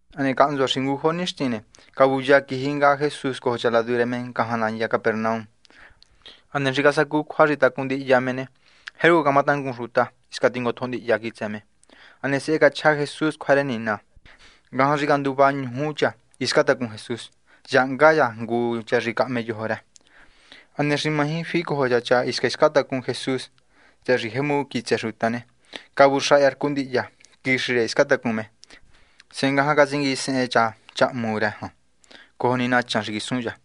Hane cahntsua xi ngujo nixtin ne, cavuya quiji nga Jesús cojo cha ladu rë me ngajan nandya Capernaum. Hane xi casacu cjua xi tacun ndihya me ne, jercu camatangun xuta, hisca tingotjo ndihya quitsë me. Hane sehe cachja Jesús cjua rë Nina. Ngajan xi canduva ñuju cha hiscan tacun Jesús, yahahnga cha ngu cha xi cahme yojo rë. Hane xi maji ficojo cha cha hisca hiscan tacun Jesús, tsëhë xi jemu quitsë xuta ne, cavuxaha cha rcu ndihya quixi rë hiscan tacun me. Sehe ngajan catsinguisehen cha cha hmu rë jan cojo ni nachan xi quisun cha.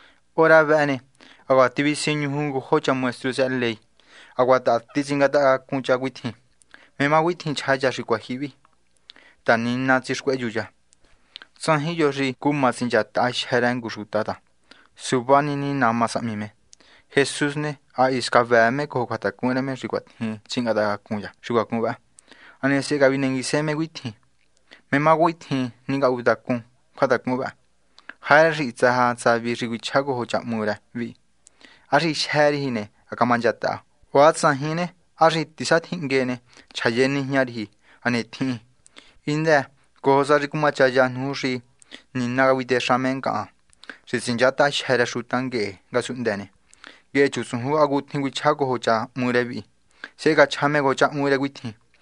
Hora vëhë ne, hacuaha tivisiñuju ngujo cha maestru tsëhë ley, hacuaha taha titsingatahacacun cha cuitjin: “¿Mé má cuitjin chja cha xi cuijyihi vi?, ta Nina tsixcuehyu cha. Tsajin yo xi cuma tsinchataha jyë́ rë ngu xuta ta suva ni Nina má sahmi me.” Jesús ne, ha hisca vëë me cojo cjuatacun rë me xi cuatjin tsingatahacacun cha xi cuacún vë, hane sehe cavinenguise me cuitjin: ―¿Mé má cuatjin ningatuhuntacun cjuatacun vëhë? ¿Jarë xi hitsë sa tsavi xi cuichjá cojo cha hmu rë vi? ¿Há xi: “Jyë́ riji ne, ha camanchataha?” O há tsajin ne, ¿há xi: “Tisatjinhngue ne, chjaye nijña riji, hane tjihin?” Hindë cojo sa xi cumachaya nuju xi Nina cavitexa me ngahan xi tsinchátaha jyë́ rë xuta nguehe ngasunhndë ne, nguehe chutsujun hacutjin cuichjá cojo cha hmu rë vi. Sehe cachja me cojo cha hmu rë cuitjin: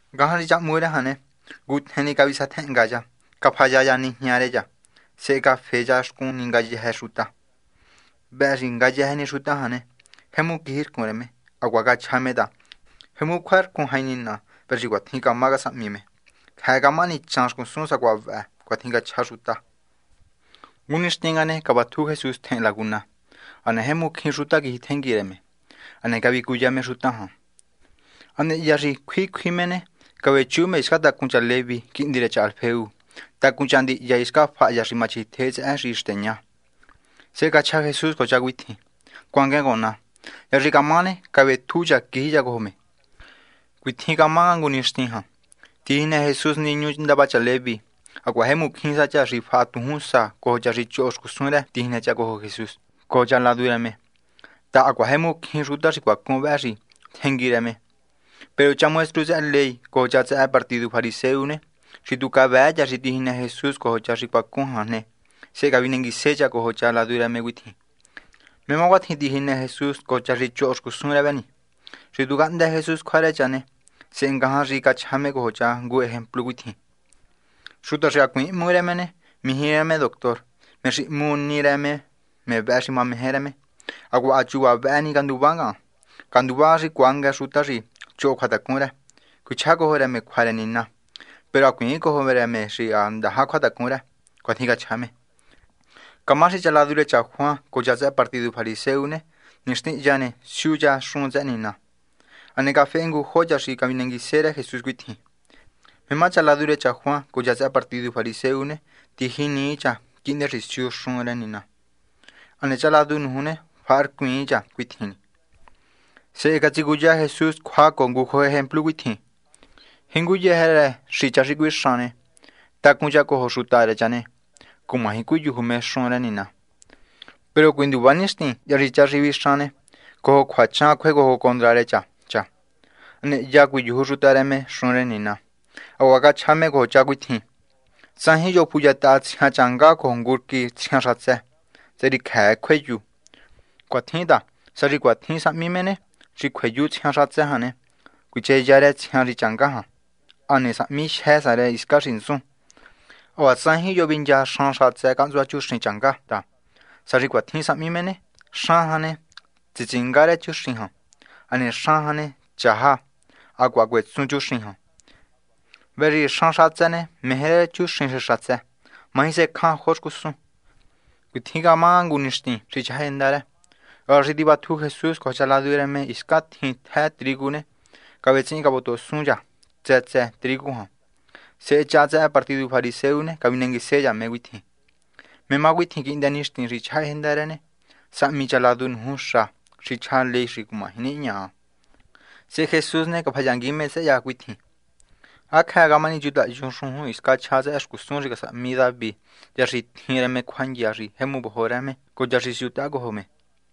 Ngajan xi cha hmu rë jan ne, ngutjen ni cavisatjenhnga cha, cafaya cha nijña rë cha, sehe cafe cha xcun ni ngayëjë xuta. Vëhë xi ngayëjë ni xuta jan ne, jemu quijircun rë me. Hacuaha cachja me ta: ―Jemu cjuarcun jain Nina. Vëhë xi cuatjin camá casahmi me. Cjëë camahani chaan xcusun sacuaha vëhë. ―Cuatjin cachja xuta. Ngu nixtin nga ne, cavatju Jesús tjehen laguna. Hane jemu cjín xuta quijitjengui rë me. Hane cavicuya me xuta jan. Hane hya xi cjui cjui me ne, cavechu me hisca tacun cha Leví, quihndi rë cha Alfeo. Tacun cha ndihya hiscan faha cha xi machjitje tsëhë xi xteña. Sehe cachja Jesús cojo cha cuitjin: ―Cuanguen cojo ná. Hya xi camá ne, cavetju cha, quiji cha cojo me. Cuitjin camá nga ngu nixtin jan, tijinë Jesús niñu ndava cha Leví. Hacuaha jemu cjín sa cha xi faha tujúnsa cojo jingu sa cha tsehen tijinë cha cojo Jesús cojo cha ladu rë me, ta hacuaha jemu cjín xuta xi cuacún vë xi tjengui rë me. Peru cha maestru tsëhë ley cojo cha tsëhë partidu fariseo ne xi tu cavëë cha xi tijinë Jesús cojo cha xi cuacún jan ne, sehe cavinenguise cha cojo cha ladu rë me cuitjin: ―¿Mé má cuatjin tijinë Jesús cojo cha xi choho xcusun rë vë ni? Xi tu cahndë Jesús cjua rë cha ne, sehe ngajan xi cachja me cojo cha ngu ejemplu cuitjin: ―Xuta xi hacuiin hmu rë me ne, mijí rë me doctor. Me xi hmu ni rë me ne, me vëhë xi mameje rë me. Hacuaha ha chuva vëhë ni canduvá ngahan. Canduvá cuanguë xuta xi choho cjuatacun rë, cuichjá cojo rë me cjua rë Nina. Peru hacuiin cojo me xi ha tyjahi cjuatacun rë. ―Cuatjin cachja me. Camá xi cha ladu rë cha Juan cojo cha tsëhë partidu fariseo ne, nixtin hya ne siu cha xun tsëhë Nina. Hane cafehe ngujo cha xi cavinenguise rë Jesús cuitjin: ―¿Mé má cha ladu rë cha Juan cojo cha tsëhë partidu fariseo ne, tijinii cha quihndë ta, siu cha xun rë Nina, hane cha ladu nuju ne, faharcuiin cha cuatjin ni? Sehe catsicuya Jesús cjua cojo ngujo ejemplu cuitjin: ―Jinguyëjë rë xi cha xi cuixan ne, tacun cha cojo xuta rë cha ne, cumaji cuiyuju me xun rë Nina. Peru cuinduva nixtin hya xi cha xi vixan ne, cojo cjuachan cjuecojo condra rë cha cha. Hane hya cuiyuju xuta rë me xun rë Nina. Hacuaha cachja me cojo cha cuitjin: ―Tsajin yo xi fuyataha tsjian changá cojo ngu rquí tsjian xatsë ta tsëhë xi cjëë cjueyu. Cuatjin ta, sá xi cuatjin sahmi me ne, xi cjueyu tsjian xatsë jan ne, cuicheya rë tsjian xi changá jan hane sahmi jyë sa rë hiscan xi ntsun. Hacuaha tsajin yo xi vincha xan xatsë cahntsua chuxin changá ta, sá xi cuatjin sahmi me ne xan jan ne, tsitsinga rë chuxin jan. Hane xan jan ne, chajan. Hacuaha cuetsun chuxin jan. Vëhë xi xan xatsë ne meje rë chuxin xi xatsë. Maji secjan jo xcusun. Cuitjin camá nga ngu nixtin xi chjahájenda rë. Hora xi tivatju Jesús cojo cha ladu rë me hiscan tjin tjë trigu ne, cavetsihin cavotohosun cha tsë tsë trigu jan. Sehe cha tsëhë partidu fariseo cavinenguise cha me cuitjin: ―¿Mé má cuatjin quihndë nixtin xi chjahájenda rë ne, sahmi cha ladu nuju xa xi chja ley xi cumaji nihña? Sehe Jesús ne, cafayangui me tsëhë cha cuitjin: ―¿Há cjëë camahani chutayun xujun hiscan chja tsëhë xcusun xi casahmi David hya xi tjin rë me cjuandya xi jemu vojo rë me cojo cha xi siutaha cojo me?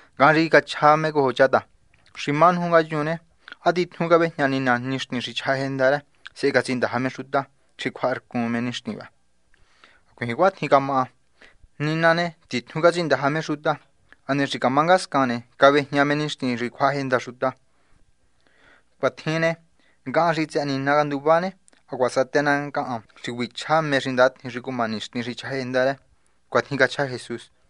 Ngajan xi cachja me cojo cha ta: ―Xi má nuju ngayun ne, ¿há titjun cavejña Nina nixtin xi chjahájenda rë, sehe catsindaja me xuta xi cjuaharcun rë nixtin vëhë? ¡Hacuiin cuatjin camá! Nina ne, titjun catsindaja me xuta, hane xi camá ngascan ne, cavajña me nixtin xi cjuahajenda xuta. Cuatjin ne, ngahan xi tsëhë Nina canduvá ne, hacuaha satë ná ngahan sacuaha nai rë xi cuichjá mé xi ndatjin xi cuma nixtin xi chjahájenda rë. ―Cuatjin cachja Jesús.